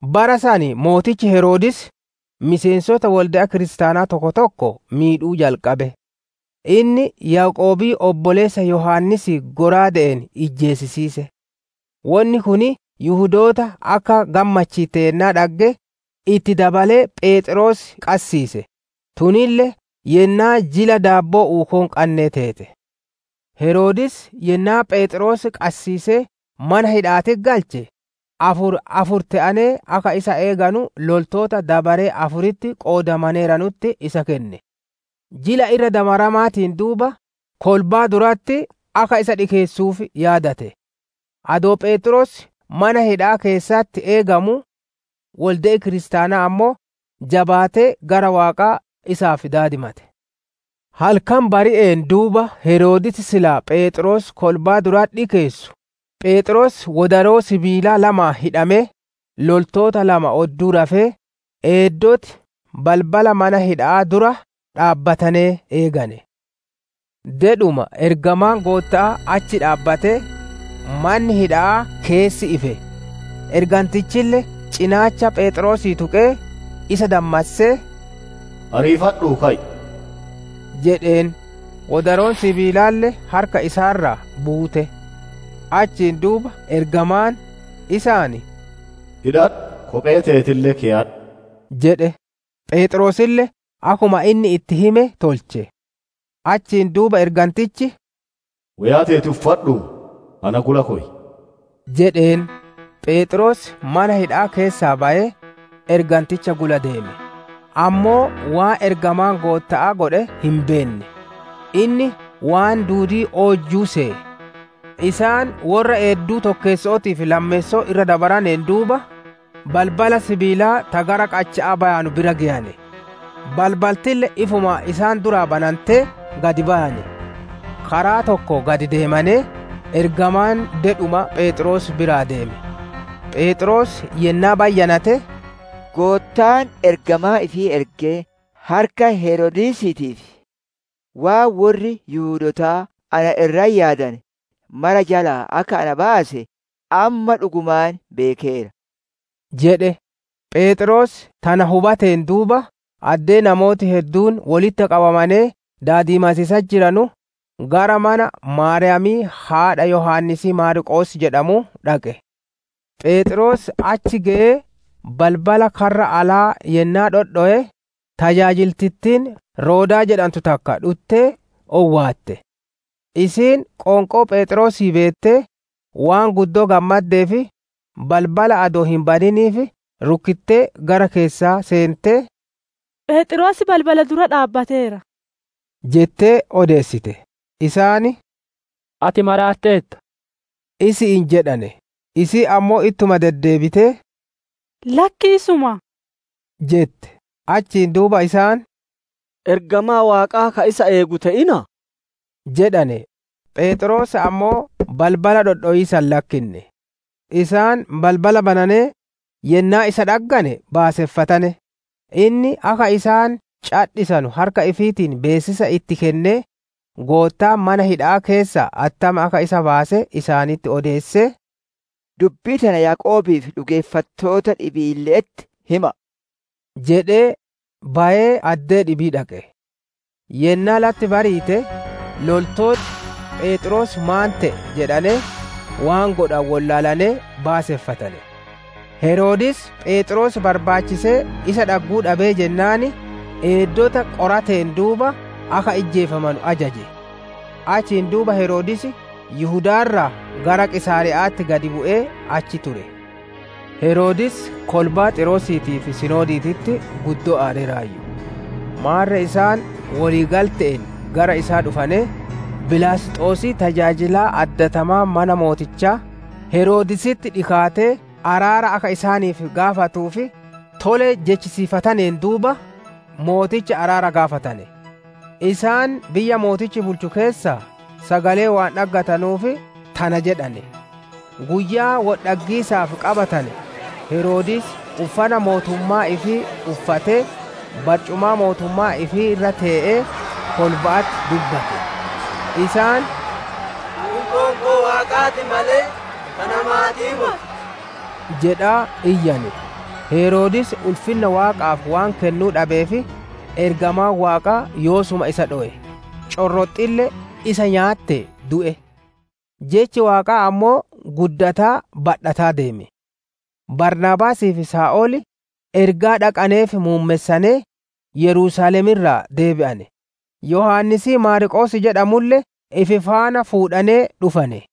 Bara san mootichi Heroodis, miseensota wolde'a kiristaanaa tokko tokko miidhuu jalqabe. Inni Yaaqoobii obboleessa Yohaannisii shallaaga'aan ijjeesise. Wonni kun Yihudoota akka gammachiitte yennaa dhagge, itti dabalee Pheexroos qassiise; tunille yennaa Jila Daabboo Uukoo hin qannee teete. Heroodis yennaa Pheexroos qassiisee mana hidha'aatitti galche, afur afur te'anee akka isa eeganu loltoota dabaree afuritti qoodamaneeranutti isa kenne. Jila Irra Dabaramaatiin duuba kolbaa duratti akka isa dhikeessuuf yaadate. Adoo Pheexroos mana hidha'aa keessatti eegamuu, wolde'i kiristaanaa ammoo jabaatee gara Waaqaa isaaf daadimate. Halkan bari'een duuba Heroodis silaa Pheexroos kolbaa duratti dhikeessu, Pheexroos wodaroo sibiilaa lamaan hidhamee, loltoota lama odduu rafee, eeddoti balbala mana hidha'aa dura dhaabbatanee eegane. Dedhuma ergamaan Gootta'aa achi dhaabbatee, manni hidha'aa keessi ife. Ergantichille cinaacha Pheexroosii tuqee, isa dammassee, «Ariifadhuu ka'i!» jedheen. Wodaroon sibiilaalle harka isaa irraa buute. Achiin duuba ergamaan, isaan «Hidhadhu! Kophee teetille keyadhu» jedhe. Pheexroosille akkuma inni itti hime tolche. Achiin duuba ergantichi, «Woyaa teeti uffadhuu na gula koy» jedheen. Pheexroos mana hidha'aa keessaa bayee, erganticha gula deeme; ammoo waan ergamaan Gootta'aa godhe hin beenne; inni waan duudii oojjuu seye. Isaan worra eedduu tokkeesso'ootii fi lammeesso'oo irra dabaraneen duuba, balbala sibiilaa ta gara qacha'aa bayanu bira geyane; balbaltille ifumaan isaan duraa banantee, gad bayane. Karaa tokko gad deemanee, ergamaan dedhuma Pheexroos biraa deeme. Pheexroos yennaa bayyanate, «Goottaan ergamaa ifii ergee harka Heroodisiitii fi waan worri Yihudootaa na irratti yaadane mara jalaa akka ana baase, amma dhugumaan beekeera» jedhe. Pheexroos tana hubateen duuba, addee namooti hedduun wolitti qabamee daadimatiisatti jiru, gara mana Maariyaamii haadha Yohaannisii Maarqoos jedhamuu dhaqe. Pheexroos achi geyee balbala karra alaa yennaa dhodhowe, tajaajiltittiin Roodaa jedhantu takka dhuttee owwaatte. Isiin qoonqoo Pheexroosii beettee, waan guddoo gammaddeef, balbala adoo hin baniniif rukkittee gara keessaa seentee, «Pheexroos balbala dura dhaabbateera!» jettee odeessite. Isaan, «Ati maraatteerta!» isi'iin jedhane. Isiin ammoo ittuma deddeebitee, «Lakkii isuma» jette. Achiin duuba isaan, «Ergamaa Waaqaa ka isa eegu te'innaa» jedhane. Pheexroos ammoo balbala dhodhowiisa hin lakkinne; isaan balbala bananee yennaa isa dhaggane baaseffatane. Inni akka isaan cadhisanu harka ifiitiin beessisa itti kennee, Goottaan mana hidha'aa keessaa attam akka isa baase isaanitti odeessee, «Dubbii tana Yaaqoobii fi dhugeeffattoota dhibiille'etti hima'a» jedhee, bayee addee dhibii dhaqe. Yennaa latti bariite, loltooti, «Pheexroos maan te'e?» jedhanee, waan godhanu wollaalanee baaseffatane. Heroodis Pheexroos barbaachisee isa dhagguu dhabee jennaan, eeddota qorateen duuba akka ijjeefamanu ajaje; Achiin duuba Heroodis Yihudaa irraa gara Qiisaariya'atti gad bu'ee achi ture. Heroodis kolbaa Xiiroosiitii fi Sidooniititti guddoo aareeraayyu. Maarre isaan wolii galte'een gara isaa dhufanee, Bilaasxosii tajaajilaa addatamaa mana mootichaa, Heroodisitti dhikaatee araara akka isaaniif gaafatuuf, tole jechisiifataneen duuba, mooticha araara gaafatane; isaan biyya mootichi bulchu keessaa sagalee waan dhaggatanuuf tana jedhane. Guyyaa wol dhaggiisaaf qabatane, Heroodis uffana mootummaa ifii uffatee, barcumaa mootummaa ifii irra tee'ee, kolba'atti dubbate. Isaan, «Tun qoonqoo waaqaa ti malee, ta namaatii moti» jedhaa iyyane. Heroodis ulfinna Waaqaaf waan kennuu dhabeef, ergamaan Waaqaa yoosuma isa dhowe; corroxxille isa nyaattee du'e. Jechi Waaqaa ammoo, gudddataa badhataa deeme. Baarnaabaasii fi Saa'ol ergaa dhaqaneef muummessanee, Yerusaalem irraa deebi'ane; Yohaannisii Maarqoos jedhamulle ifi faana fuudhanee dhufane.